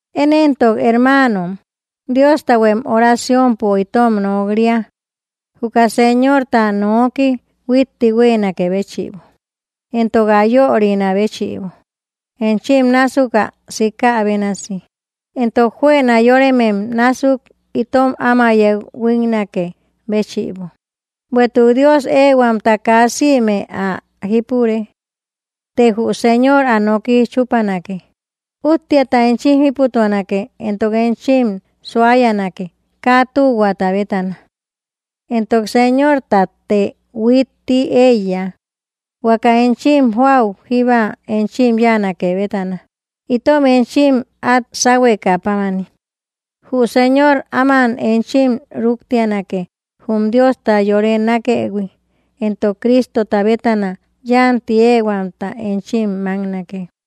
Én éntok, hermaanom, Diostahuem oraciompo itom nok‑ria, juka Señorta noki huitti huéenakë béchïbo, entok ä yörinä béchïbo, enchim násuk ä sikä bénasi, entok juëna yóremem násuk itom áma yeu huíknakë béchïbo; bueïtuk Dios éehuamta kaa sïme ä jípure. Të jü Señor ä noki chúpanake. Útteata enchim jíputuanake entok enchim suayanake, kaa tühuaata bétana. Entok Señortatte huitti éiya, huaka enchim joäu jíba enchim yáanake bétana, itom enchim át sáhuekä pámani. Jü Señor áman enchim rúktianake, jum Diosta yore nákëhui, entok Cristota bétana yánti éehuamta enchim máknake.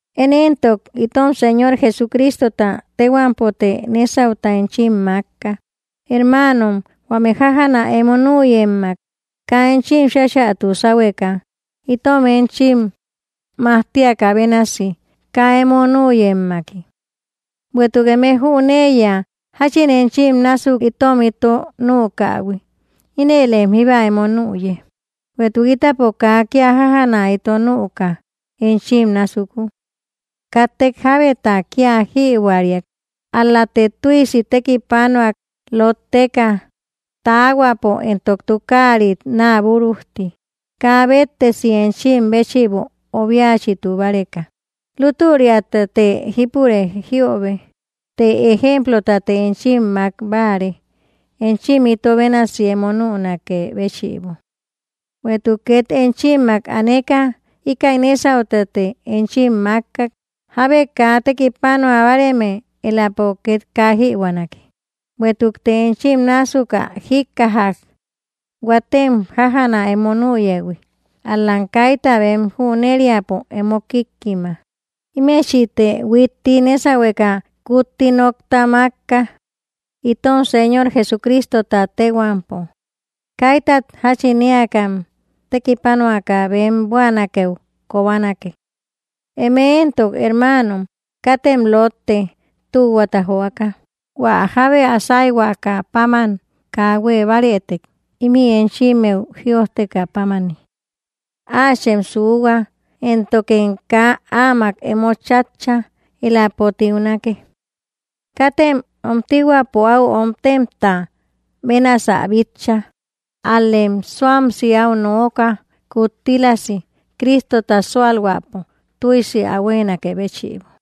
Én éntok, itom Señor Jesucristota téhuampote nésauta enchim mákka, hermaanom, huame jájana emo nüyemmak kaa enchim cháchätu sáhueka, itom enchim majtiakä bénasi kaa emo nüyemmaki. Bueïtuk eme jüneiya jáchin enchim násuk itom ito nükähui; ínëlem jíba emo nüye. Bueïtuk ítapo kaa kía jájana ito nüka enchim násuku. Katte jábeta kía jïbuäriak, ál‑late tüisi tekipanuak, lótteka taahuapo entok tukaarit náa búrujti, kaa béttesi enchim béchïbo obiachitu báreka. Lútüriatate jípure jïobe, të ejemplotate enchim mák báare, enchim ito bénasi emo nünakë béchïbo. Bueïtuk két enchimmak aneka íkäi nésautate enchim mákkak: Jábe kaa tekipanua báareme, éläpo két kaa jïbuänake. Bueïtukte enchim násuk ä jíkkaja, huatem jájana emo nüyëhui, ál‑lam kaita bem jüneriäpo emo kíkkima. Ímechïte huitti nésahueka kutti nokta mákka, itom Señor Jesucristota téhuampo: kaitat jáchin éakam tekipanuaka bem buänakeu kobanake. Eme éntok, hermaanom, katem lótte tühuata joaka. Huä jábe ä sáyhuaka páman kaa huée bárëtek, ímï enchimmeu jiöjtekä pámani, áachem suuhua, éntokem kaa áamak emo chátcha; éläpo tiunake. Katem omtihuäpo áu omtemta bénasä bitcha, ál‑lem súamsi áu nooka, kuttílasi Cristota súalhuäpo tüisi ä huéenakë béchïbo.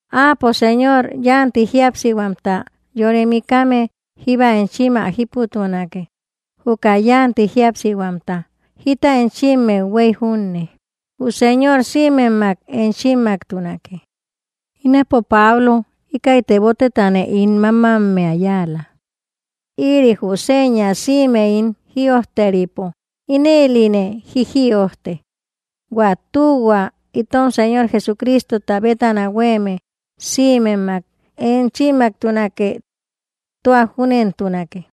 Áapo Señor yánti jíapsihuamta yore mikame jíba enchim ä jíputuanake, juka yánti jíapsihuamta jita enchimmeu huéy junne. Jü Señor sïmemmak enchimmaktunake. Ínapo Pablo íkäi tebotetane ín mámammea yáala. Ïri jü seña sïme ín jïojteripo, ínëline jíjïojte. Huä tühua itom Señor Jesucristota bétana huéeme sïmemmak enchimmaktunake. Tua júnentunake.